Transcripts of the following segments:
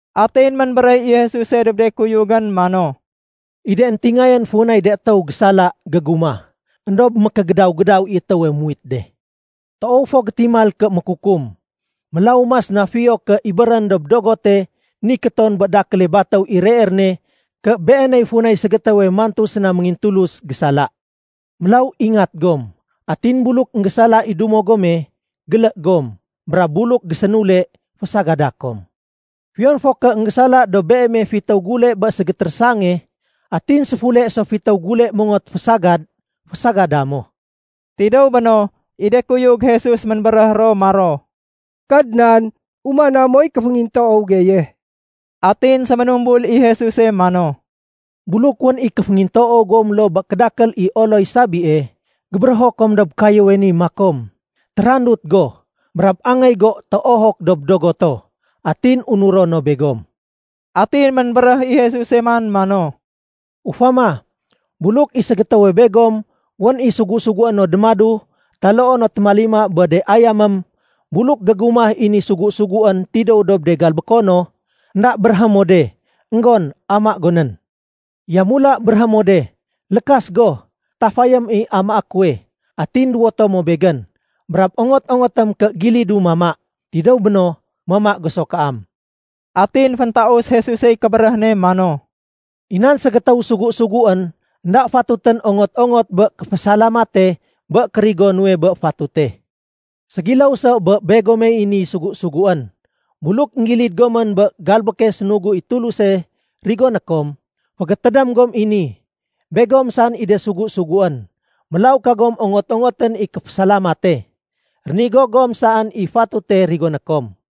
Atin ménbéréh i Jesuse dob de kuyugén mano, “I de éntingayén funay de étéw gésala gégumah, éndob mékégédaw-gédaw i étéwe muwit de. Toow fo gétimal ké mékukum, mélaw mas na fiyo ké ibérén dob dogote nikéton bé dakéle batéw i reer ne ké beeney funay ségétéwe mantu séna méngintulus gésala. Mélaw ingat gom. Atin buluk énggésala i dumo gome, gélé gom. Brab buluk gésénule, fésagada kom. Fiyon fo ké énggésala dob beeme fitéw gule bé ségétérésange, atin séfule so fitéw gule mongot fasinsiya, fésagada mo.” Tidéw béno, i de kuyug Jesus ménbéréh ro maro, “Kadnan, umana moy kéféngintoow geye.” Atin séménumbul i Jesuse mano, “Buluk wén i kéféngintoow gom loo bé kédakél i oloy sabie, gébérého kom dob kayéwe ni makom, ‘Térandut go, brab angéy go téohok dob dogoto’, atin unuro no begom.” Atin ménbéréh i Jesuse man mano, “Ufama, buluk i ségétéwe begom wén i sugu-sugué no démadu taloo no témalima bé de ayamém, buluk gégumah i ni sugu-suguén tidéw dob de galbéko no, énda béréhé mo de, ‘Enggon, ama go nén.’ Yamula béréhé mo de, ‘Lékas go, tafayém i amaé kuwe, atin duwoto mo begén, brab ongot-ongotém ké gilidu mama. Tidéw béno, mama go so kaam.’” Atin féntaus Jesusey kébéréh ne mano, “I nan ségétéw sugu-suguén, énda fatutén ongot-ongot bé kéfésalamate bé kérigo nuwe bé fatute. Ségiléw so bé begomey ni sugu-suguén. Buluk énggilid gomén bé galbéke sénugu i Tuluse rigoné kom, fégétédém gom i ni, begom saén i de sugu-suguén, mélaw kagom ongot-ongotén i kéfésalamate. Rénigo gom saén i fatute rigoné kom.”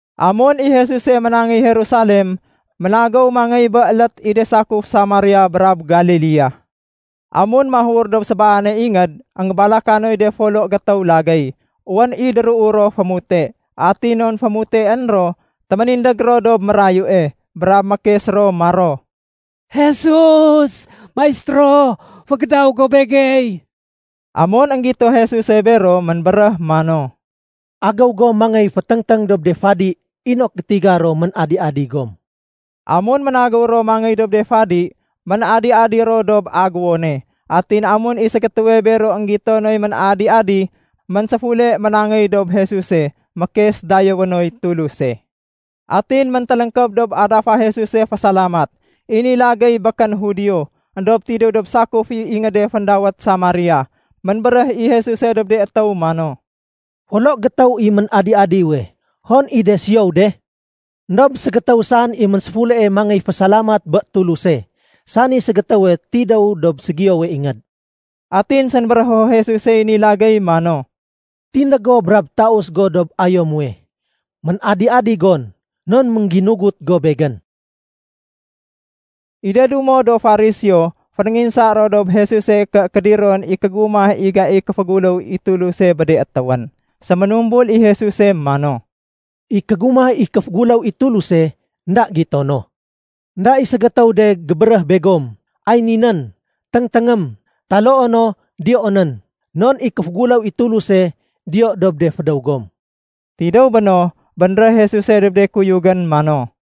Amun i Jesuse ménangéy Jerusalem, ménagéw mangéy bé élét i de sakuf Samaria brab Galilea. Amun mahur dob sébaane ingéd, énggébalakay de folo gétéw lagéy. Wén i déruu ro fémute. Atin non fémuteén ro, téménindég ro dob mérayue. Brab mékes ro maro, “Jesus! Maistéro! Fégédaw go Begey!” Amun énggito Jesuse bero, ménbéréh mano, “Agéw gom mangéy féténgténg dob de fadi inok gétiga ro ménadi-adi gom.” Amun ménagéw ro mangéy dob de fadi, ménadi-adi ro dob aguwone. Atin amun i ségétéwe bero énggito noy ménadi-adi, ménséfule ménangéy dob Jesuse, mékes dayéwé noy Tuluse. Atin méntéléngkéb dob adafa Jesuse fésalamat. I ni lagéy békén Judio, éndob tidéw dob sakuf i ingéde féndawét Samaria. Ménbéréh i Jesuse dob de étéw mano, “Folo gétéw i ménadi-adiwe. Hon i de siyow de? Endob ségétéw saén i ménséfulee mangéy fésalamat bé Tuluse, sani ségétéwe tidéw dob ségiyowe ingéd.” Atin sénbérého Jesusey ni lagéy mano, “Tindég go brab taus go dob ayo muwe. Ménadi-adi gon non méngginugut go Begén.” I de dumo do Fariseo fénénginsa ro dob Jesuse ké kédiron i kégumah i gaiy kéféguléw i Tuluse bé de étéwén. Séménumbul i Jesuse mano, “I kégumah i kéféguléw i Tuluse énda gitono. Enda i ségétéw de gébéréh begom, ‘Ay ninén, téngténgém!’ Taloo no, ‘Diyoonén.’ Non i kéféguléw i Tuluse diyo dob de fédéw gom.” Tidéw béno, bénréh Jesuse dob de kuyugén mano,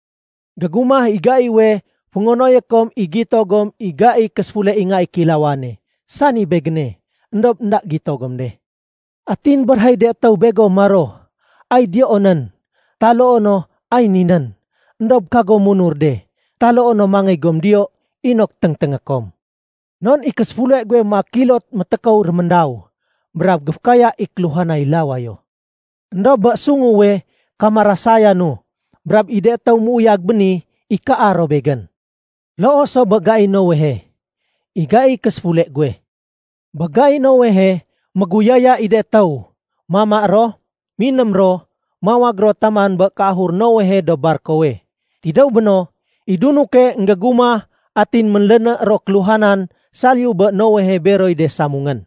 “Gégumah i gaiwe féngonoyé kom i gito gom i gaiy késéfule i Nga i Kéilawane, sani Begéne. Endob énda gito gom de. Atin béréhéy de étéw begom maro, ‘Ay diyoonén.’ Taloo no, ‘Ay ninén.’ Endob kagom munur de taloo no mangéy gom diyo inok téngténgé kom. Non i késéfule guwe maak kilot métékow réméndaw brab géfékaya i kéluhanay lawayo. Endob bé sunguwe, kamarasayanu, brab i de étéw méuyag béni, ikaa ro Begén. Loo so bé gai Noehe, i gaiy késéfule guwe. Bé gai Noehe, méguyaya i de étéw, mama ro, miném ro, mawag ro taman bé kéahur Noehe dob barkowe. Tidéw béno, i dunuke énggégumah atin ménléné ro kéluhanan saliyu bé Noehe beroy de samungén.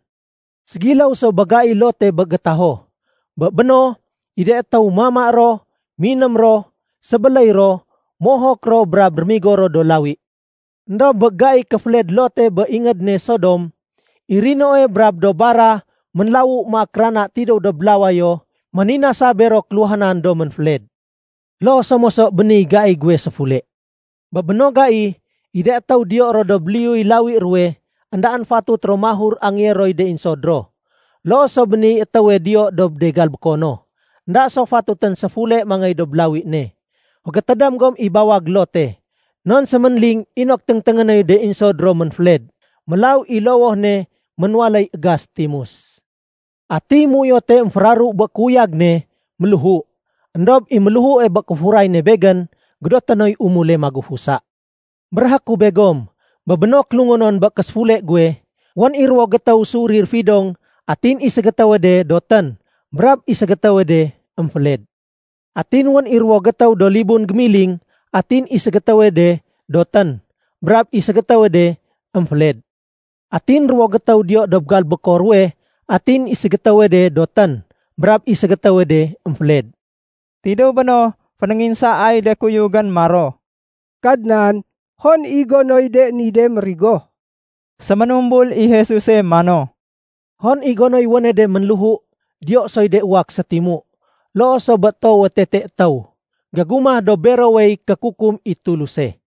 Ségiléw so bé gai Lote bé gétaho. Bé béno, i de étéw mama ro, miném ro, sébéléy ro, mohok ro, brab rémigo ro do lawi. Endob bé gai kéféled Lote bé ingéd ne Sodom, i rinoe brab do bara ménlawu maak rana tidéw dob lawayo méninasa bero kéluhanan do ménféled. Loo so moso bé niy gai guwe séfule. “Bé béno gai, i de étéw diyo ro dob liyuy lawi ruwe, éndaén fatut ro mahur angéyé roy de insod ro. Loo so bé niy étéwe diyo dob de galbékono, énda so fatutén séfule mangéy dob lawi ne. Fégétédém gom i bawag Lote non séménling inok téngténgé noy de insod ro ménféled, mélaw i lowoh ne ménwaléy égas timus. Atiy méuyote émféraru bé kéuyag ne, méléhu. Endob i méléhue bé kéfuray ne Begén, gédoté noy umule magufusa. Béréhé ku begom, bé béno kélungonon bé késéfule guwe, wén i ruwo gétéw séurir fidong, atin i ségétéwe de dotén, brab i ségétéwe de émféled. Atin wén i ruwowe gétéw do libun gémiling, atin i ségétéwe de dotén, brab i ségétéwe de émféled. Atin ruwo gétéw diyo dob galbéko ruwe, atin i ségétéwe de dotén, brab i ségétéwe de émféled.” Tidéw béno, fénénginsaay de kuyugén maro, “Kadnan, hon i gonoy de ni de mérigo?” Séménumbul i Jesuse mano, “Hon i gonoy wéne de ménléhu, diyo soy de uwak sétimu. Loo so bé toowe tete étéw, gégumah dob berowey kékukum i Tuluse.”